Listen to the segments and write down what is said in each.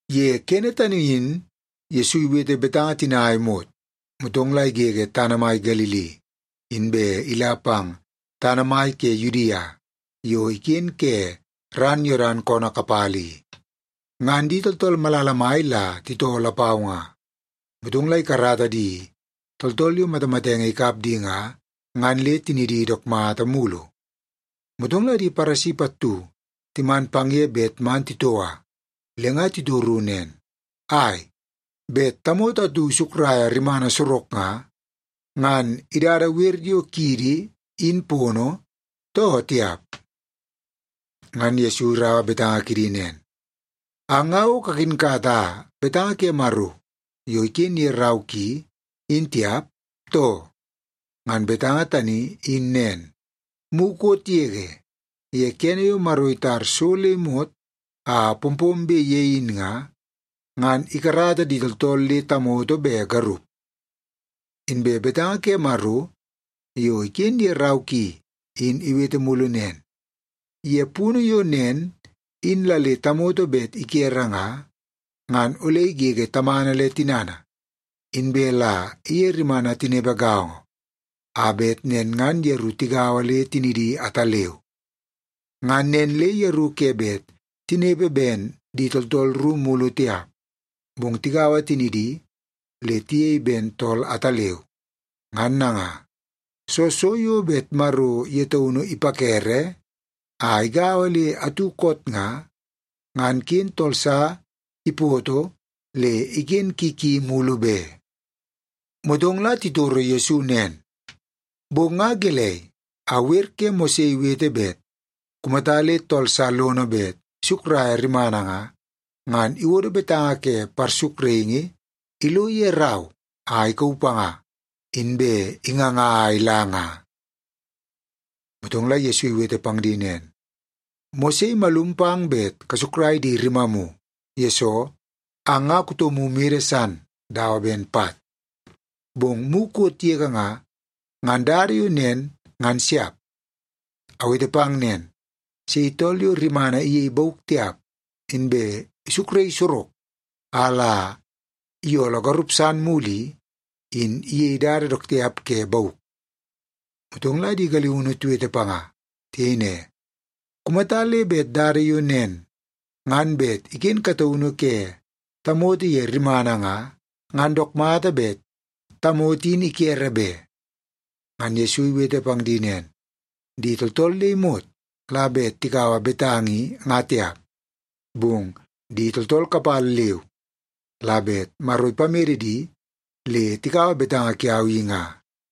Ye kene tani in Yesu iwete betanga tina a imot, motong la igege tana mai Galili, inbe ila pang tana mai ke Yudia yo iken ke ran Yodan koonoo kapala i. Ngan di tooltool malala mai la titoo lapau nga, motong la ikarata di tooltool yo matamatenge ikap di nga, ngan le tinidi dook mata mulu. Motong la di Paresi pattu timan pang ye bet man titoua. Le nga titoru nen, “Ai, bet tamoto atu isukraia rimana sorok nga, ngan idada wer yo kiidi in pono, too tiap?” Ngan Yesu iraua betanga kidi nen, “Ang nga o kakinkata betanga ke Maro yo iken ye rau ki, in tiap, too? Ngan betanga tani in nen, mukot yege ye kene yo Maro itar so le imot a pompombe ye in nga, ngan ‘ikarata di tooltool le tamoto be garup.’ Inbe betanga ke Maro yo iken ye rau ki in iwete mulu nen, ‘Ye punu yo nen in la le tamoto bet ikere nga, ngan ole igege tamana le tinana, inbe la iye rimana tinepe gaongo, a bet nen ngan yeru tigaua le tinidi ataleu.’ Ngan nen le yeru ke bet tinepe ben di tooltool ru mulu tiap, bong tigaua tinidi le tiyei ben tool ataleu. Ngan nanga, soo so yo bet Maro ye taunu ipakere a igaua le atu koot nga, ngan ken tool sa ipoto le iken ki ki mulu be.” Motong la titoro Yesu nen, “Bong nga gelei, a wer ke Mose iwete bet kumata le tool sa lono bet isukraia rimana nga, ngan iwodo betanga ke parsukraingi ilo ye rau a ikauu panga, inbe inganga a ila nga?” Motong la Yesu iwete pang di nen, “Mose imalum pang bet kasukrai di rimamu, yesoo ang nga kutomu mede san dawa ben pat. Bong mukot yege nga, ngan dada yo nen, ngan siap. Awete pang nen, sei tool yo rimana iyei bauk tiap, inbe isukraii sorok a la iyooloo garup san mulu i, in iyei dada dook tiap ke bauk.” Motong la di galiunu tiwete panga. Tiyei ne, “Kumata le bet dada yo nen ngan bet iken kataunu ke tamoto ye rimana nga, ngan dook mata bet tamoto in ikere be.” Ngan Yesu iwete pang di nen, “Di tooltool le imot la bet tikaua betanga i nga tiap, bong di tooltool kapala leu la bet Maro ipamede di le tikaua betanga kiau i nga.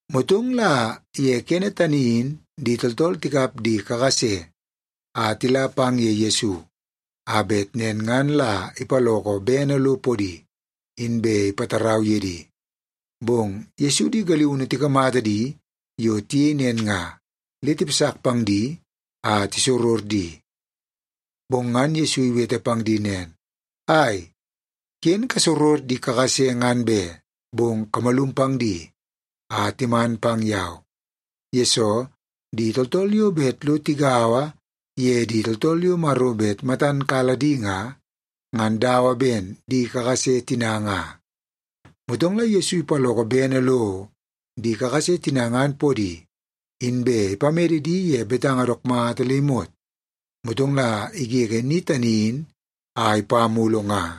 Motong la ye kene tani in di tooltool tikap di kakase a tila pang ye Yesu, a bet nen ngan la ipaloko bene lo podi, inbe ipatarau ye di. Bong Yesu di galiunu tikamata di yo tiyei nen nga, le tipasak pang di a tisoror di. Bong ngan Yesu iwete pang di nen, “Ai, ken kasoror di kakase ngan be! Bong kamalum pang di a timan pang yau. Yesoo, di tooltool yo bet lo tigaua ye di tooltool yo Maro bet matan kala di nga, ngan dawa ben di kakase tina nga.” Motong la Yesu ipaloko bene lo di kakase tina ngan podi, inbe ipamede di ye betanga dook mata le imot, motong la igege ni tani in a ipa mulu nga.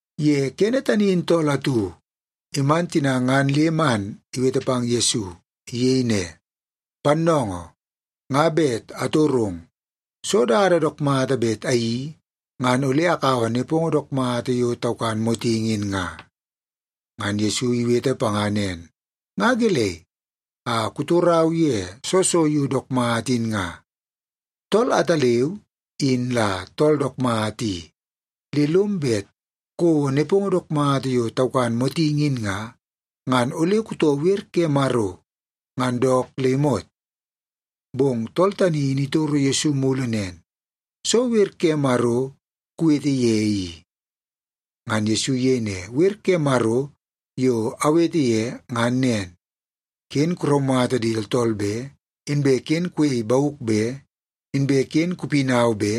Ye kene tani in tool atu iman tina ngan le man iwete pang Yesu. Iyei ne, “Pannoongoo, nga bet atorong. Soo dada dook mata bet ayeii, ngan ole akaua nepongo dook mata yo taukan motingi in nga?” Ngan Yesu iwete panga nen, “Nga gelei a kutorau ye soo so yo dook mata in nga? Tool ataleu in la tool dook mata i. Le lom bet kouo nepongo dook mata yo taukan motingi in nga, ngan ole kutoo wer ke Maro ngan dook le imot.” Bong tool tani in itoro Yesu mulu nen, “Soo wer ke Maro kuwete ye i?” Ngan Yesu iyei ne, “Wer ke Maro yo awete ye ngan nen: ‘Ken kuraumata di tooltool be; inbe ken kuyei bauk be; inbe ken kupinau be;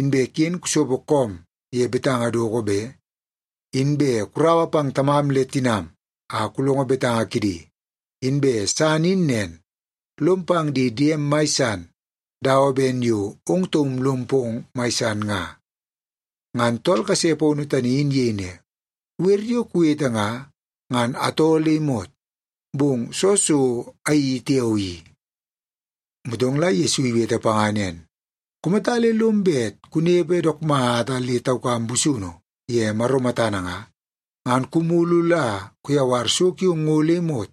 inbe ken kusopo koom ye betanga doko be; inbe kuraua pang tamam le tinam a kulongo betanga kidi.’ Inbe san in nen, ‘Lom pang di diem mai san dawa ben yo ong taum lom pong mai san nga.’” Ngan tool kase paunu tani iyei ne, “Wer yo kuwete nga, ngan atoo le imot. Bong soo so ayeii tiao i?” Motong la Yesu iwete panga nen, “Kumata le lom bet kunepe dook mata le taukam busunu ye Maro matana nga, ngan kumulu la kuyawar so kiong ngo le imot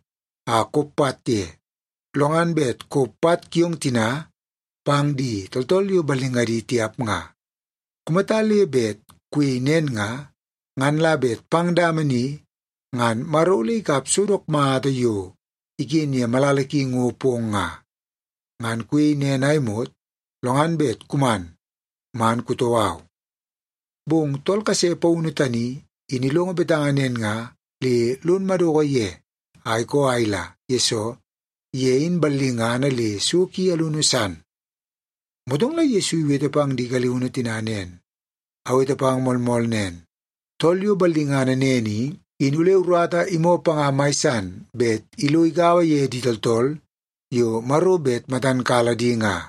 a kop pat ye, lo ngan bet kop pat kiong tina pang di tooltool yo ballingadi tiap nga. Kumata le bet kuyei nen nga, ngan la bet pang dama ni ngan Maro ole ikap so dook mata yo iken ye malala ki ngo pong nga. Ngan kuyei nen a imot, lo ngan bet kuman man kutoo au.” Bong tool kase paunu tani in ilongo betanga nen nga, le lon madoko ye a ikoo a ila, yesoo ye in ballingana le so ki alunu san. Motong la Yesu iwete pang di galiunu tina nen, “Awete pang moolmool nen, tool yo ballingana nen i, in ole urata imoo panga mai san bet ilo igaua ye di tooltool yo Maro bet matan kala di nga.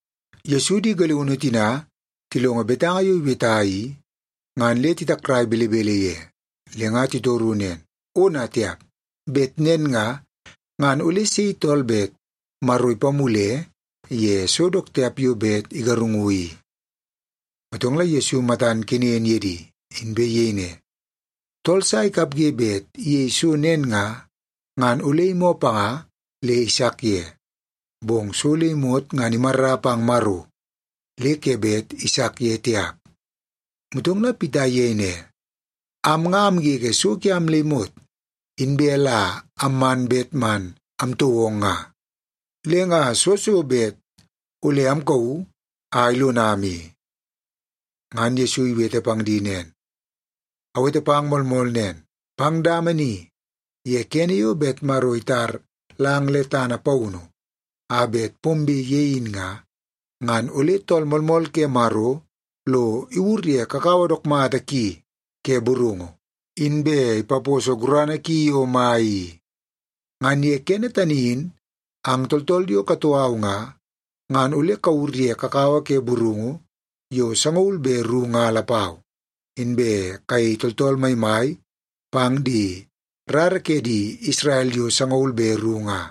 Yesu di galiunu tina tilongo betanga yo iweta i, ngan le titakrai belebele ye. Le nga titoru nen, “Ona tiap! Bet nen nga, ngan ole sei tool bet Maro ipamule ye so dook tiap yo bet igarungu i?” Motong la Yesu matan kenen ye di, inbe iyei ne, “Tool sa ikapge bet iyei so nen nga, ngan ole imoo panga le isak ye, bong so le imot ngan imarra pang Maro le ke bet isak ye tiap.” Motong la Pita iyei ne, “Am nga amgege so kiam le imot, inbe la amman bet man amtoo ong nga. Le nga soo so bet ole amkauu a ilonam i?” Ngan Yesu iwete pang di nen, “Awete pang moolmool nen. Pang dama ni ye kene yo bet Maro itar lang le tana paunu a bet pombe ye in nga, ngan ole Tool Moolmool ke Maro lo iwur ye kakawa dook mata ki ke burungu, inbe ipaposo gurana ki yo mai i. Ngan ye kene tani in ang tooltool yo katoo au nga, ngan ole kawur ye kakawa ke burungu yo sangaul be ru nga lapau, inbe kayei tooltool maimai pang di rara ke di Isrel yo sangaul be ru nga.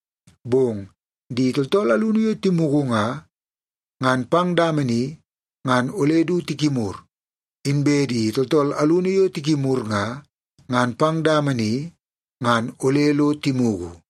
Bong di tooltool alunu yo timugu nga, ngan pang dama ni ngan ole du tikimur. Inbe di tooltool alunu yo tikimur nga, ngan pang dama ni ngan ole lo timugu.”